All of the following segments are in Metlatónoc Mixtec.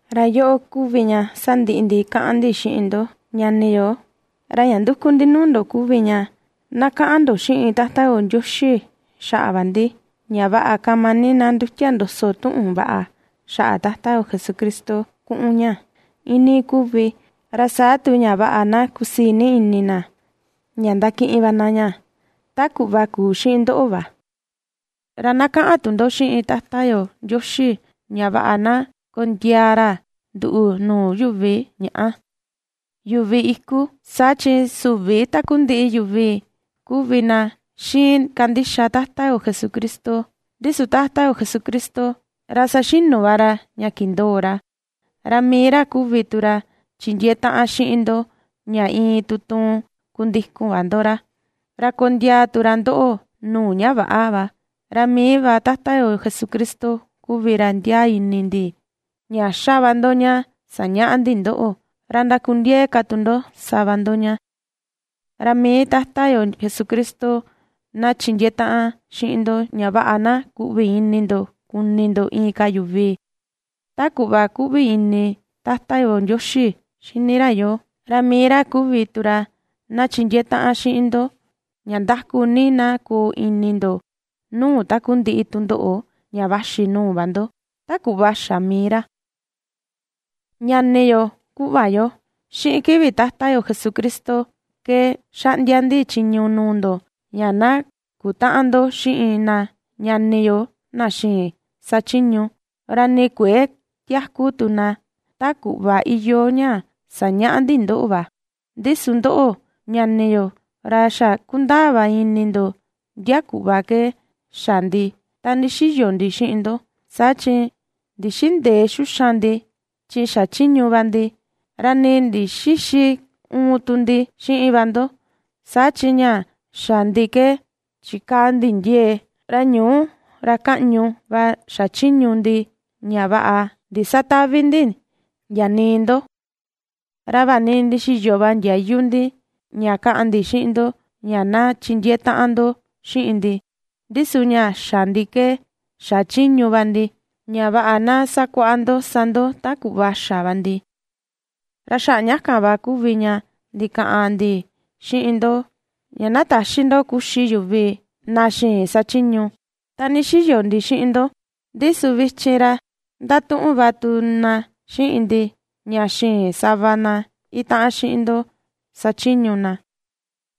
Ra yoꞌo kuvi ña ^sandiꞌi ndi kaꞌan ndi xiꞌin ndo ñani yo, ra ña nduku ndi nuu ndo kuvi ña na kaꞌan ndo xiꞌin Tata yo Ndioxi xaꞌa va ndi ña vaꞌa kama ni na ndutia ndoso tuꞌun vaꞌa xaꞌa Tata yo Jesucristo kuꞌun ña iinii kuvi, ra saa tu ña vaꞌa na kusii ni ini na ña ndakiꞌin va na ña, ta kuꞌva kuu xiꞌin ndoꞌo va. Ra na kaꞌan tu ndo xiꞌin Tata yo Ndioxi ña vaꞌa na kondiaa ra nduꞌu nuu yuvi ña̱ꞌà, yuvi iku, saa chi süvi takundiꞌi yuvi kuvi na ^xiin kandixa Tata yo Jesucristo. Ndi su Tata yo Jesucristo ra saxinu va ra ña kindoo ra, ra mii ra kuvi tu ra chindiee taꞌan xiꞌin ndo ña iin tutuun kundikun va ndo ra, ra kondiaa tu ra ndoꞌo nuu ña väꞌa va. Ra mii va Tata yo Jesucristo kuvi ra ndiaa ini ndi ña ^xa va ndo ña sañaꞌa ndi ndoꞌo, ra ndakundiee ka tu ndo sa va ndo ña. Ra mii Tata yo Jesucristo na chindiee taꞌan xiꞌin ndo ña vaꞌa na kuꞌvi ini ndo kuni ndo inka yuvi ta kuꞌva kuꞌvi ini Tata yo Ndioxi xini ra yoo, ra mii ra kuvi tu ra na chindiee taꞌan xiꞌin ndo ña nda̱ku̱ ni na koo ini ndo nuu takundiꞌi tundoꞌo ña vaxi nuu va ndo, ta kuꞌva xa mii ra. Ñani yo, kuꞌva yo, xiꞌin kivi Tata yo Jesucristo ke ^xaꞌndia ndi chiñu nuu ndo ña na kutäꞌan ndo xiꞌin na ñani yo na xïin sachiñu, ra nii kuëe tiaku tu na ta kuꞌva iyoo ña sañaꞌa ndi ndoꞌo va. Ndi su ndoꞌo, ñani yo, ra xa kundaa va ini ndo ndia kuꞌva ke xa ndi ta ndixiyo ndi xiꞌin ndo, saa chi ndixïndee xuxan ndi chi xachiñu va ndi, ra nii ndixïxi uun tu ndi xiꞌin va ndo, saa chi ña xa ndi ke chikaa ni ndi ndiee ra ñuu ra kaꞌñu va xachiñu ndi ña vaꞌa ndisatävi ndi ndia nii ndo. Ra vaꞌa ni ndixiyo va ndiayu ndi ña kaꞌan ndi xiꞌin ndo ña na chindiee taꞌan ndo xiꞌin ndi, ndi su ña xa ndi ke xachiñu va ndi, ña vaꞌa na sakuaꞌa ndo sa ndo ta kuꞌva xa va ndi. Ra xaꞌa ña kan va kuvi ña ndikaꞌan ndi xiꞌin ndo ña na täxi ndo kuxi yuvi na xïin sachiñu, ta ndixiyo ndi xiꞌin ndo. Ndi su vichin ra ndatuꞌun va tu na xiꞌin ndi ña xïin sava na itaꞌan xiꞌin ndo sachiñu na,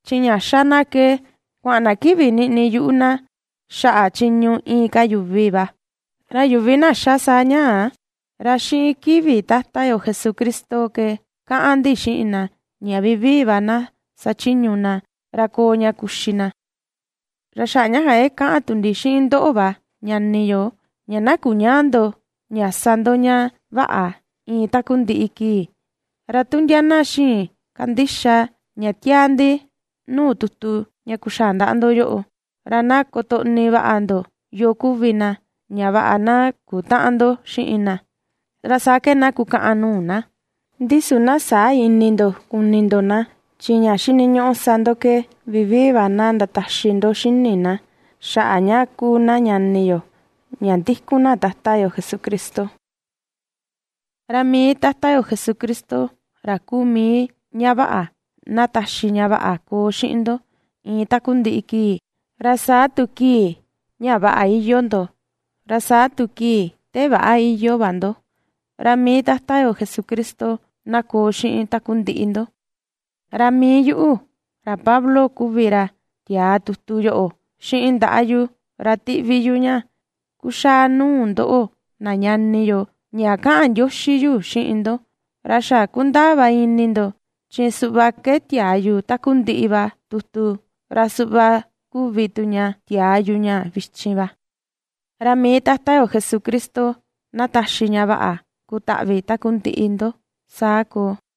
chi ña ^xa na ke kuaꞌan na kiꞌvi niꞌni yuꞌu na xaꞌa chiñu inka yuvi va. Ra yuvi na ^xa saa ñaa, ra xiꞌin kivi Tata yo Jesucristo ke kaꞌan ndi xiꞌin na ña vivii va na sachiñu na ra koo ña kuxi na. Ra xaꞌa ña kan ke kaꞌan tu ndi xiꞌin ndoꞌo va ñani yo ña na kuñäa ndo ña sa ndo ña vaꞌa iin takundiꞌi kii. Ra tu ndia na xïin kandixa ña tiaa ndi nuu tutu ña kuxaa ndaꞌa ndo yoꞌo, ra na kotoꞌni vaꞌa ndo yoo kuvi na ña vaꞌa na kutäꞌan ndo xiꞌin na, ra saa ke na kukaꞌan nuu na. Ndi su na säa ini ndo kuni ndo na, chi ña xiniñuꞌu sa ndo ke vivii va na ndataxi ndo xini na xaꞌa ña kuu na ñani yo ña ndikun na Tata yo Jesucristo. Ra mii Tata yo Jesucristo ra kuu mii ña vaꞌa na taxi ña vaꞌa koo xiꞌin ndo iin takundiꞌi kii, ra saa tu kii ña vaꞌa iyoo ndo, ra saa tu kii te väꞌa iyoo va ndo, ra mii Tata yo Jesucristo na koo xiꞌin takundiꞌi ndo. Ra mii yuꞌu, ra Pablo kuvi ra tiaa tutu yoꞌo xiꞌin ndaꞌa yu ra ^tiꞌvi yu ña kuxaa nuu ndoꞌo na ñani yo ña kaꞌan ndioxi yu xiꞌin ndo. Ra xa kundaa va ini ndo, chi suꞌva ke tiaa yu takundiꞌi va tutu ra suꞌva kuvi tu ña tiaa yu ña vichin va. Ra mii Tata yo Jesucristo na taxi ña vaꞌa kutaꞌvi takundiꞌi ndo. Saa koo.